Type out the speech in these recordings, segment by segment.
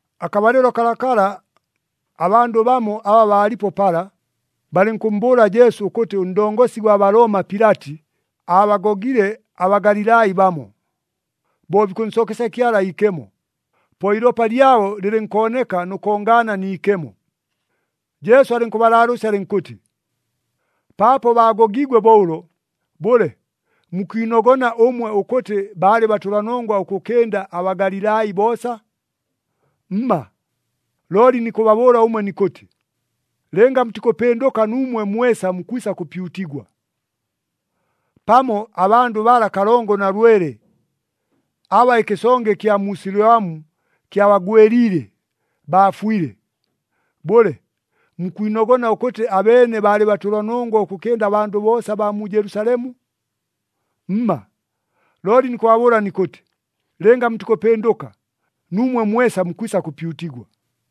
Akabalɨlo kalakala, abandʉ bamo aba baalipo pala, balɨnkʉmmbʉʉla Jesu ʉkʉtɨ ʉndongosi gwa Balooma Pilati aabagogile aBagalilai bamo, bo bikʉnsookesya Kyala iikemo, po iilopa lyabo lɨlɨnkooneka nʉ kongaana ni ikemo. Jesu alɨnkʉbalaalʉʉsya alɨnkʉtɨ, “Paapo baagogiigwe bo ʉlo, bʉle, mukwinogona ʉmwe ʉkʉtɨ baalɨ batʉlanongwa ʉkʉkɨnda aBagalilai boosa? Mma! Looli nikʉbabʉʉla ʉmwe nikʉtɨ, lɨnga mutikʉpɨndʉka nuumwe mwesa mukwisa kʉpyutigwa! Pamo abandʉ bala kalongo na lwele aba ɨkɨsonge ɨkya mu Siloamu kyabagwɨliile, baafwile. Bʉle, mukwinogona ʉkʉtɨ abeene baalɨ batʉlanongwa ʉkʉkɨnda abandʉ boosa abaa mu Jelusalemu? Mma! Looli nikʉbabʉʉla nikʉtɨ, lɨnga mutikʉpɨndʉka, nuumwe mwesa mukwisa kʉpyutigwa.”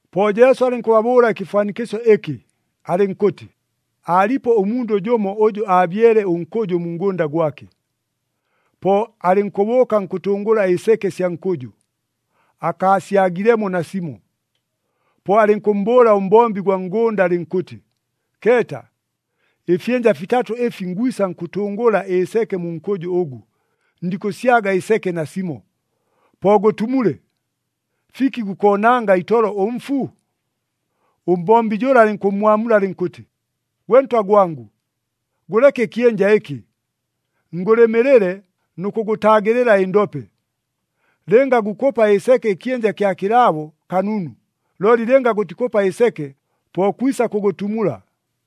Po Jesu alɨnkʉbabʉʉla ɨkɨfwanikɨsyo ɨkɨ, alɨnkʉtɨ, “Aalipo ʉmundʉ jʉmo ʉjʉ aabyele ʉnkʉjʉ mu ngʉnda gwake, po alɨnkʉbʉʉka nkʉtʉngʉla ɨseke sya nkʉjʉ, akaasyagilemo nasimo. Po alɨnkʉmmbʉʉla ʉmbombi gwa ngʉnda alɨnkʉtɨ, ‘Keeta! Ɨfyɨnja fitatʉ ɨfi ngwisa nkʉtʉngʉla ɨseke mu nkʉjʉ ʉgʉ, ndikʉsyaga ɨseke nasimo. Po gʉtumule! Fiki gukoonanga itolo ʉmfu?’ “Ʉmbombi jʉla alɨnkʉmmwamula alɨnkʉtɨ, ‘Gwe ntwa gwangʉ, gʉleke ɨkyɨnja ɨkɨ, ngʉlɨmɨlɨle nʉ kʉgʉtaagɨlɨla ɨndope. Lɨnga gukʉpa ɨseke ɨkyɨnja kya kɨlaabo, kanunu! Looli lɨnga gʉtikʉpa ɨseke, po kwisa kʉgʉtumula.’”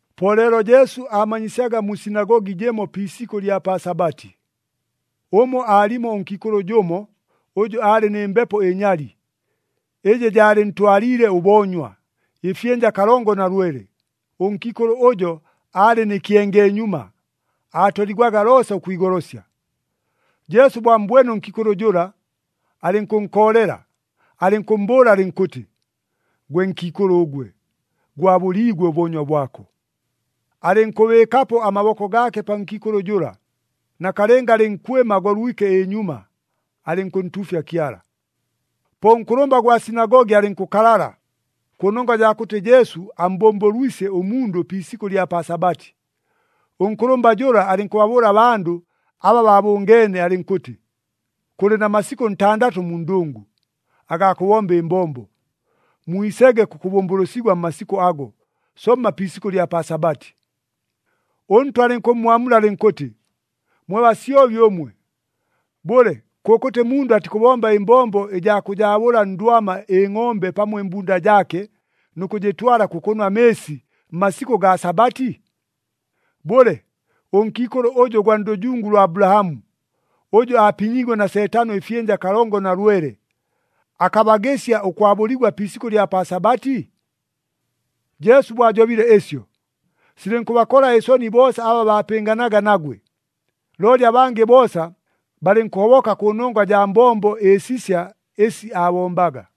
Po leelo Jesu aamanyisyaga mu sinagogi jɨmo pi isikʉ ɨlya pa Sabati. Ʉmo aalimo ʉnkiikʉlʉ jʉmo, ʉjʉ aalɨ nɨ mbepo ɨnyali, ɨjɨ jaalɨntwaliile ʉboonywa, ɨfyɨnja kalongo na lwele. Ʉnkiikʉlʉ ʉjo aalɨ nɨ kyengeenyuma, aatoligwaga loosa ʉkwigolosya. Jesu bo ammbwene ʉnkiikʉlʉ jʉla, alɨnkʉnkoolela, alɨnkʉmmbʉʉla alɨnkʉtɨ, “Gwe nkiikʉlʉ ʉgwe, gwabʉliigwe ʉboonywa bwako!” Alɨnkʉbɨɨkapo amaboko gaake pa nkiikʉlʉ jʉla, nakalɨnga alɨnkwɨma agolwike ɨnyuma, alɨnkʉntuufya Kyala. Po ʉnkʉlʉmba gwa sinagogi alɨnkʉkalala, kʉnongwa jaa kʉtɨ Jesu ammbʉmbʉlwisye ʉmundʉ pi isikʉ ɨlya pa Sabati. Ʉnkʉlʉmba jʉla alɨnkʉbabʉʉla abandʉ aba baabʉngeene alɨnkʉtɨ, “Kʉlɨ na masikʉ ntandatʉ mu ndʉngʉ, agaa kʉbomba ɨmbombo. Mwisege kʉkʉbʉmbʉlʉsigwa mmasikʉ ago, somma pi isikʉ ɨlya pa Sabati!” ɄNtwa alɨnkʉmmwamula alɨnkʉtɨ, “Mwe basyobi ʉmwe! Bʉle, kʉkʉtɨ mundʉ atikʉbomba ɨmbombo ɨjaa kʉjaabʉla ndwama ɨngʼombe pamo ɨmbunda jaake, nʉ kʉjɨtwala kʉkʉnwa amɨɨsi, mmasikʉ gaa Sabati? Bʉle, ʉnkiikʉlʉ ʉjʉ ʉgwa ndʉjungu lwa Abulahamu, ʉjʉ aapinyiigwe na Seetano ɨfyɨnja kalongo na lwele, akabagɨsya ʉkwabʉligwa pi isikʉ ɨlya pa Sabati?” Jesu bo ajobile ɨsyo, silɨnkʉbakola ɨsoni boosa aba baapɨnganaga nagwe. Looli abangɨ boosa, balɨnkʉhoboka kʉnongwa jaa mbombo ɨsisya ɨsi aabombaga.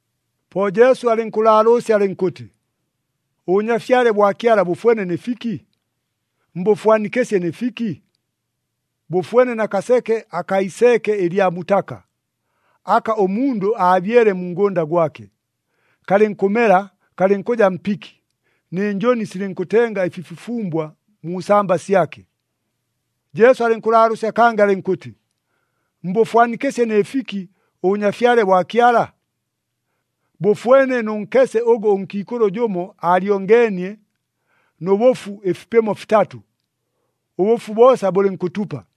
Po Jesu alɨnkʉlaalʉʉsya alɨnkʉtɨ, “ɄBʉnyafyale bwa Kyala bʉfwene nɨ fiki? Mbʉfwanikɨsye nɨ fiki? Bʉfwene na kaseke akaa iseeke ɨlya mutaka, aka ʉmundʉ aabyele mu ngʉnda gwake. Kalɨnkʉmela kalɨnkʉja mpiki, nɨ njʉni silɨnkʉtenga ɨfifufumbwa mu samba syake.” Jesu alɨnkʉlaalʉʉsya kangɨ alɨnkʉtɨ, “Mbʉfwanikɨsye nɨ fiki, ʉBʉnyafyale bwa Kyala? Bʉfwene nʉ nkese ʉgʉ ʉnkiikʉlʉ jʉmo aalyongeenie nʉ bʉfu ɨfipɨmo fitatʉ, ʉbʉfu boosa bʉlɨnkʉtupa.”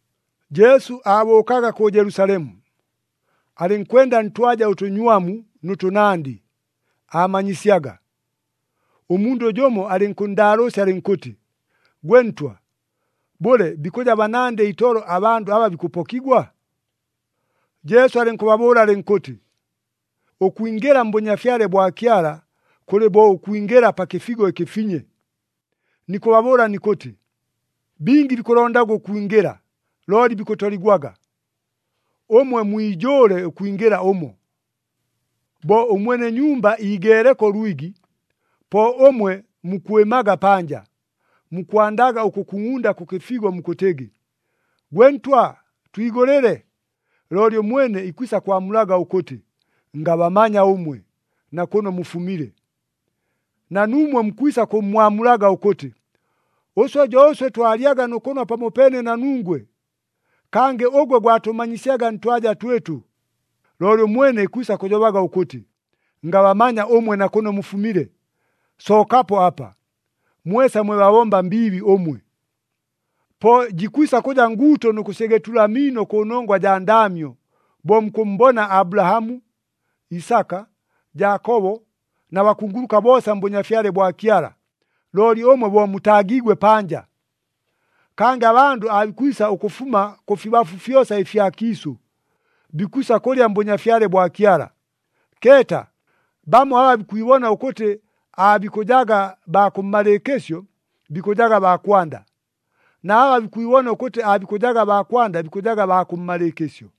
Jesu aabʉʉkaga kʉ Jelusalemu, alɨnkwenda ntwaja ʉtʉnywamu nʉ tʉnandɨ, aamanyisyaga. Ʉmundʉ jʉmo alɨnkʉnndaalʉʉsya alɨnkʉtɨ, “Gwe ntwa, bʉle bikʉja banandɨ itolo abandʉ aba bikʉpokigwa?” Jesu alɨnkʉbabʉʉla alɨnkʉtɨ, “Ʉkwingɨla mBʉnyafyale bwa Kyala kʉlɨ bo ʉkwingɨla pa kɨfigo ɨkɨfinye. Nikʉbabʉʉla nikʉtɨ, bingi bikʉlondaga ʉkwingɨla, looli bikʉtoligwaga! Ʉmwe mwijʉʉle ʉkwingɨla ʉmo. Bo ʉmwene nyumba iigeeleko ʉlwigi, po ʉmwe mukwɨmaga panja, mukwandaga ʉkʉkungʼunda kʉ kɨfigo mukʉtɨgɨ, ‘Gwe ntwa, twigʉlɨle!’ Looli ʉmwene ikwisa kwamulaga ʉkʉtɨ, ‘Ngabamanya ʉmwe na kʉno mufumile!’ Na nuumwe mukwisa kʉmmwamulaga ʉkʉtɨ, ‘Ʉswe jo ʉswe twalyaga nʉ kʉnwa pamopeene na nungwe! Kangɨ ʉgwe gwatʉmanyisyaga ntwaja twɨtʉ!’ Looli ʉmwene ikwisa kʉjobaga ʉkʉtɨ, ‘Ngabamanya ʉmwe na kʉno mufumile! Sookapo apa, mwesa mwe babomba mbiibi ʉmwe!’ “Po jikwisa kʉja nguuto nʉ kʉsyegetula amiino kʉnongwa jaa ndaamyo, bo mukʉmmbona Abulahamu, Isaka, Jaakobo na bakunguluka boosa mBʉnyafyale bwa Kyala, looli ʉmwe bo mutaagiigwe panja! Kangɨ abandʉ aabikwisa ʉkʉfuma kʉfibafu fyosa ɨfya kiisʉ. Bikwisa kʉlya mBʉnyafyale bwa Kyala. “Keeta! Bamo aba bikwibona ʉkʉtɨ aabikʉjaga baa kʉmmalɨɨkɨsyo, bikʉjaga baa kwanda, na aba bikwibona ʉkʉtɨ aabikʉjaga baa kwanda, bikʉjaga baa kʉmmalɨɨkɨsyo.”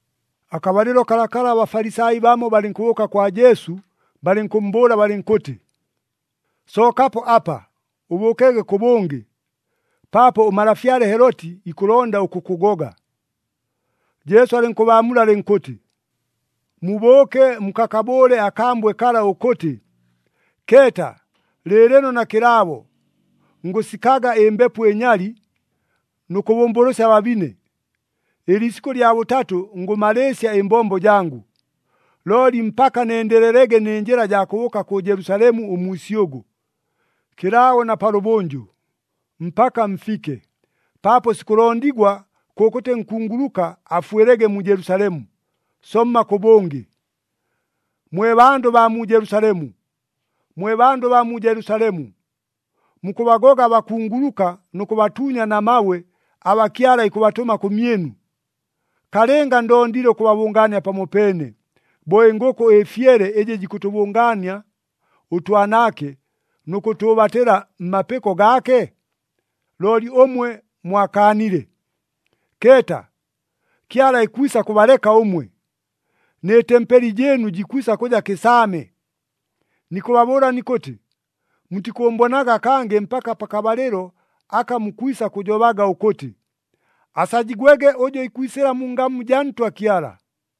Akabalɨlo kalakala aBafalisai bamo balɨnkʉbʉʉka kwa Jesu balɨnkʉmmbʉʉla balɨnkʉtɨ, “Sookapo apa, ʉbʉʉkege kʉbʉngɨ, paapo ʉmalafyale Heloti ikʉlonda ʉkʉkʉgoga.” Jesu alɨnkʉbaamula alɨnkʉtɨ, “Mubʉʉke mukakabʉʉle akambwe kala ʉkʉtɨ, ‘Keeta! Lɨɨlɨno na kɨlaabo, ngʉsikaga ɨmbepo ɨnyali nʉ kʉbʉmbʉlʉsya ababine, ɨliisikʉ lya bʉtatʉ ngʉmalɨɨsya ɨmbombo jangʉ. Looli mpaka nendelelege nɨ njɨla jaa kʉbʉʉka kʉ Jelusalemu ʉmwisyʉgʉ, kɨlaabo na palʉbʉnjʉ, mpaka mfike. Paapo sikʉlondigwa kʉkʉtɨ nkunguluka afwɨlege mu Jelusalemu, somma kʉbʉngɨ!’ “Mwe bandʉ baa mu Jelusalemu, mwe bandʉ baa mu Jelusalemu! Mukʉbagoga abakunguluka nʉ kʉbatuunya na mabwe aba Kyala ikʉbatʉma kʉmyɨnu. Kalɨnga ndondile ʉkʉbabʉngaania pamopeene, bo ɨngʉkʉ ɨfyele ɨjɨ jikʉtʉbʉngaania ʉtwanaake nʉ kʉtʉʉbatɨla mmapɨko gaake? Looli ʉmwe mwakaanile! Keeta, Kyala ikwisa kʉbaleka ʉmwe, nɨ tempeli jɨɨnu jikwisa kʉja kɨsaame! Nikʉbabʉʉla nikʉtɨ, mutikʉʉmbonaga kangɨ mpaka pakabalɨlo aka mukwisa kʉjobaga ʉkʉtɨ, ‘Asajigwege ʉjʉ ikwisɨla mu ngamu jaa Ntwa Kyala.’”